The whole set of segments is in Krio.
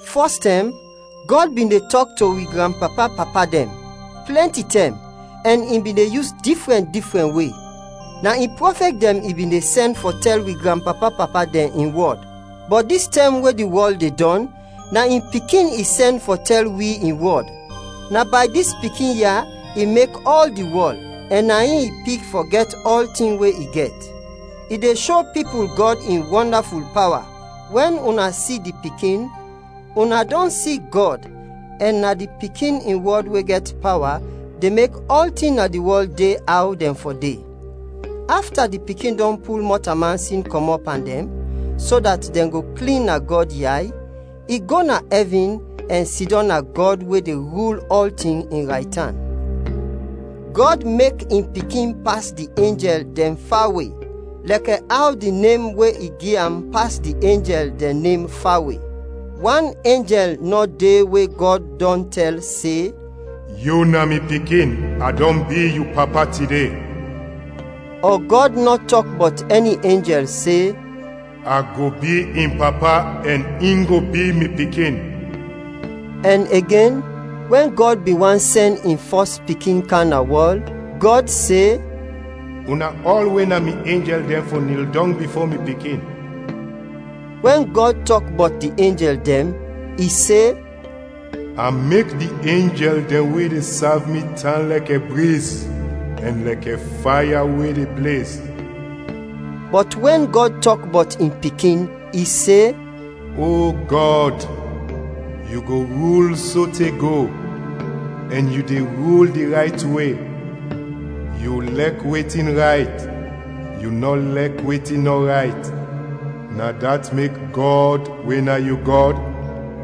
Fɔstɛm, Gɔd bin de tɔk to wi granpapa-papa dɛn, plɛnti tɛm, ɛn i bin de yus difrɛn difrɛn we. Na in prɔfɛt dɛn i bin de sɛn fɔ tɛl wi granpapa-papa dɛn in wɔd. Bɔt dis tɛm we di wɔl de dɔn, na in Pikin i sɛn fɔ tɛl wi in wɔd. Na bay dis Pikin ya, i mek ɔl di wɔl, ɛn na in i pik fɔ gɛt ɔltin we i gɛt. I de sho pipul Gɔd in wɔndaful pawa. Wɛn una si di Pikin, una dɔn si Gɔd, ɛn na di Pikin in wɔd we gɛt pawa de mek ɔltin na di wɔl de aw dɛn fɔ de. Afta di Pikin dɔn pul mɔtalman sin kɔmɔt pan dɛn, so dat dɛn go klin na Gɔd yay, i go na ɛvin ɛn sidɔm na Gɔd we de rul ɔltin, in raytan. Gɔd mek in Pikin pas di enjɛl dɛn fawe, lɛkɛ aw di nem we i gi am pas di enjɛl dɛn nem fawe. Wan enjɛl nɔ de we Gɔd dɔn tɛl se, “Yu na mi Pikin; a dɔn bi yu Papa tide.” Ɔ Gɔd nɔ tɔk bɔt ɛni enjɛl se, “A go bi in Papa, ɛn in go bi mi Pikin.” Ɛn igen, wɛn Gɔd bin want sɛn in fɔs Pikin kam na wɔl, Gɔd se, “Una ɔl we na mi enjɛl dɛn fɔ nil dɔng bifo mi Pikin.” Wɛn Gɔd tɔk bɔt di enjɛl dɛn, i se, “A mek di enjɛl dɛn we de sav mi tan lɛkɛ briz, ɛn lɛkɛ faya we de blez.” Bɔt wɛn Gɔd tɔk bɔt in Pikin, i se, “O Gɔd, yu go rul sote go! Ɛn yu de rul di rayt we. Yu lɛk wetin rayt, yu nɔ lɛk wetin nɔ rayt. Na dat mek Gɔd we na yu Gɔd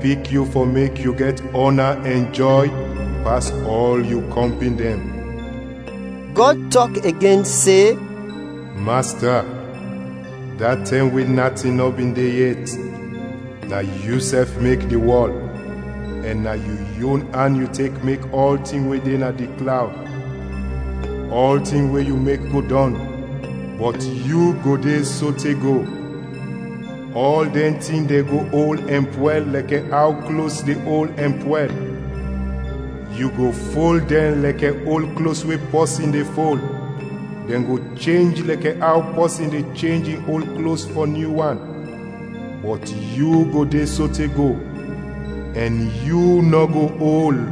pik yu fɔ mek yu gɛt ɔna ɛn jɔy pas ɔl yu kɔmpin dɛn.” Gɔd tɔk igen se, “Masta, da tɛm we natin nɔ bin de yet, na yusɛf mek di wɔl ɛn na yu yon an yu tek mek ɔltin we de na di klawd. Ɔltin we yu mek go dɔn, bɔt yu go de sote go; ɔl dɛn tin de go ol ɛn pwɛl lɛkɛ aw klos de ol ɛn pwɛl. Yu go fol dɛn lɛkɛ ol klos we pɔsin de fol, dɛn go chenj lɛkɛ aw pɔsin de chenj in ol klos fɔ nyu wan. Bɔt yu go de sote go, ɛn yu nɔ go ol.”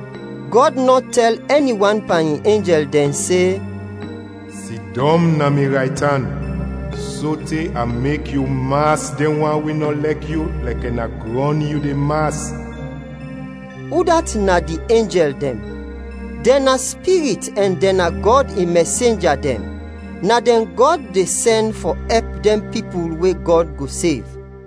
Gɔd nɔ tɛl ɛni wan pan in enjɛl dɛn se, “Sidɔm na mi raytan sote a mek yu mas dɛn wan we nɔ lɛk yu lɛkɛ na grɔn yu de mas.” Udat na di enjɛl dɛn? Dɛn na spirit ɛn dɛn na Gɔd in mɛsenja dɛn; na dɛn Gɔd de sɛn fɔ ɛp dɛn pipul we Gɔd go sev.